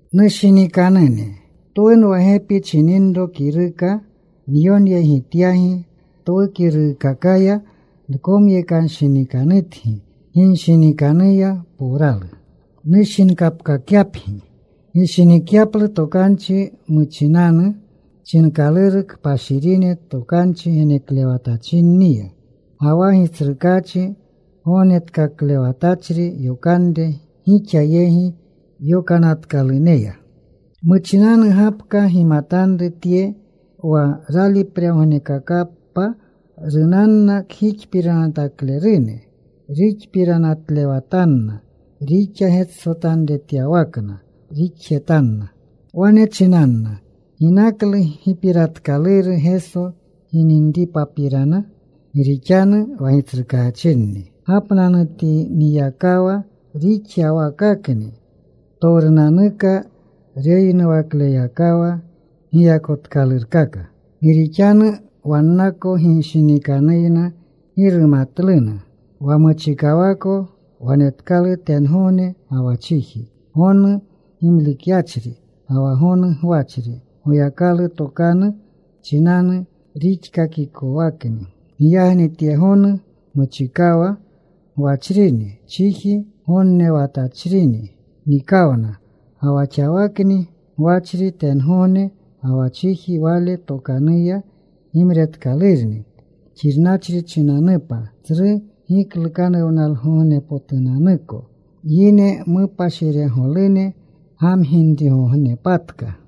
Nushinikanune, twunwa gepi chininro kiruka nyonyegityagi. Twu kiruukakaya nkomyekanshinikanutgi ginshinikanuya powralu, nushinkapkakyapgi. Gishinikyaplu tokanchi muchinanu chinkaluru kpashirine tokanchi geneklewatachinniya, ga wa Gitsrukaachi Gognetkaklewatachri yokanre gixa yegi yokanatkaluneya. Muchinanu gapka gimatanru tye, wa ralipregognekakapa runanna kgixpiranataklerune. Ruxpiranatlewatanna. Rixa getsotanretyawakna rixjetanna. Wane chinanna, “¿Ginaklu gipiratkaluru Geso gininripapirana? Gi rixanu wa gitsrukaachinni gapnanutiniyakawa rixyawakakni ptowrunanuka reyinuwakleyakawa giyakotkalurkaka.” Gi rixanu wannako ginshinikanuyna gi rumatluna wa muchikawako wanetkalu tengogne ga wa chiji, gonu gimlikyachri ga wa gonu gwachri. Goyakalu tokanu chinanu rixkakikowakni. Giyagni tye gonu muchikawa gwachrini chiji gonnewatachrini nikawna. Ga wa xawakni gwachri tengogne ga wa chiji Wale tokanuya gimretkalurni xirnachri chinanupa, tsru giklukanuwnalgognepotunanuko, yine mupashiregolune gamginrigognepatka.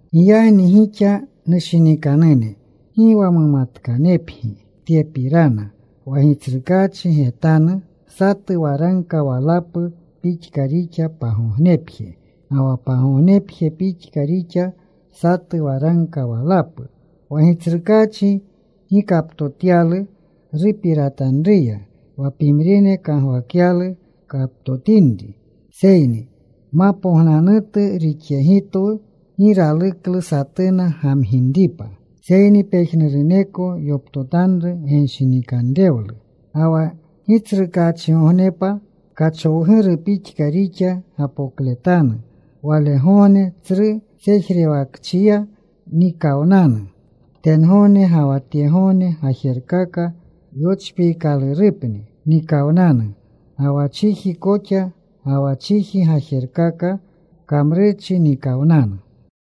Giyagni gixa, nushinikanune, gi wa mumatkanepgi tyepirana, wa Gitsrukaachi getanu satu waragka walapu pixka rixa pagognepje, ga wa pagognepje pixka rixa satu waragka walapu. Wa Gitsrukaachi gi kaptotyalu rupiratanruya wa pimrine kagwakyaluna kaptotinri. Seyni mapognanutu rixyegitwu. Gi raluklu satuna gamginripa, seyni pejnuruneko yoptotanru genshinikanrewlu. Ga wa Gitsrukaachigognepa kachowguru pixka rixa gapokletanu. Walegogne tsru sejrewakchiya nikawnanu tengogne. Ga wa tyegogne gajerkaka yochpiikalurupni nikawnanu. Ga wa chiji koxa ga wa chiji gajerkaka kamrurchi nikawnanu.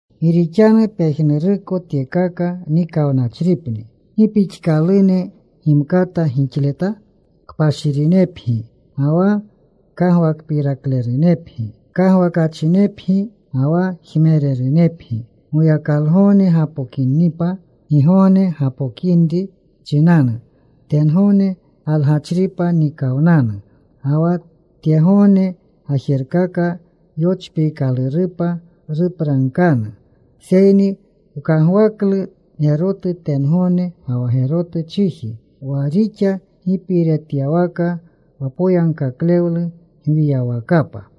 Gi rixanu pejnuruko tyekaka nikawnachripni, ¿gi pixkalune gimkata gixleta? Kpashirinepgi ga wa kagwakpiraklerunepgi. Kagwakachinepgi ga wa jmererunepgi Goyakalgogne gapokinipa. Gigogne gapokinri chinanu tengogne galgachripa nikawnanu, ga wa tyegogne gajerkaka yochpiikalurupa rupragkanu. Seyni wkagwaklu gerotu tengogne ga wa gerotu chiji wa rixa gipiiretyawaka, wa poyagkaklewlu gwiyawakapa.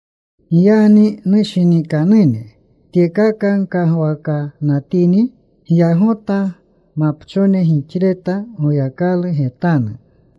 Giyagni, nushinikanune, tyekaka gkagwakanatini, gyagota mapchone gixleta Goyakalu getanu,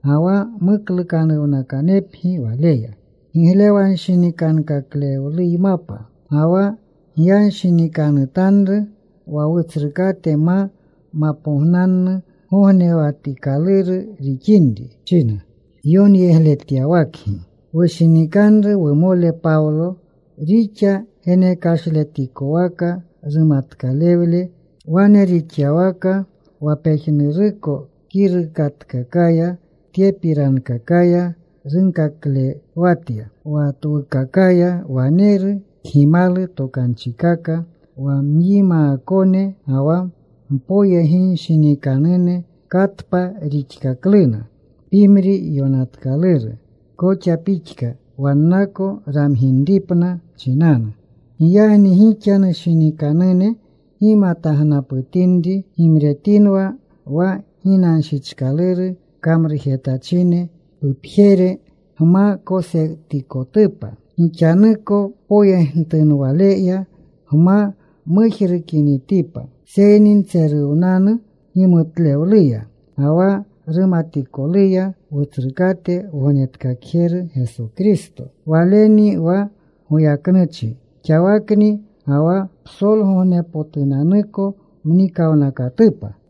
ga wa muklukanuwnakanepgi Waleya giglewanshinikanrewleymapa. Ga wa gyanshinikanutanru wa Wutsrukate ma mapognannu gognewatikaluru rixinri, china yonyegletyawakgi wushinikanru wumole Pawlo, rixa genekashletikowaka rumatkalewle. Wane rixyawaka, wa pejnuruko kirukatkakaya, tyepirankakaya runkaklewatya. Wa twukakaya waneru kgimalu tokanchikaka, wa myimaakone ga wa mpoyeginshinikanune katpa rixkakluna, pimri yonatkaluru koxa pixka, wannako ramginripna chinanu. Giyagni gixa, nushinikanune, gimatagnaputinri, gimretinwa. Wa ginanshichkaluru kamrujetachine pupjere gma kosetikotupa, gixanuko poyentunwaleya gma mujrukinitipa. Seyni ntseruwnanu gimutlewluya ga wa rumatikoluya Wutsrukate Wognetkakjeru Geso Kristo. Walenni wa goyaknuchi xawakni ga wa psolgogneshpotunanuko mnikawnakatupa.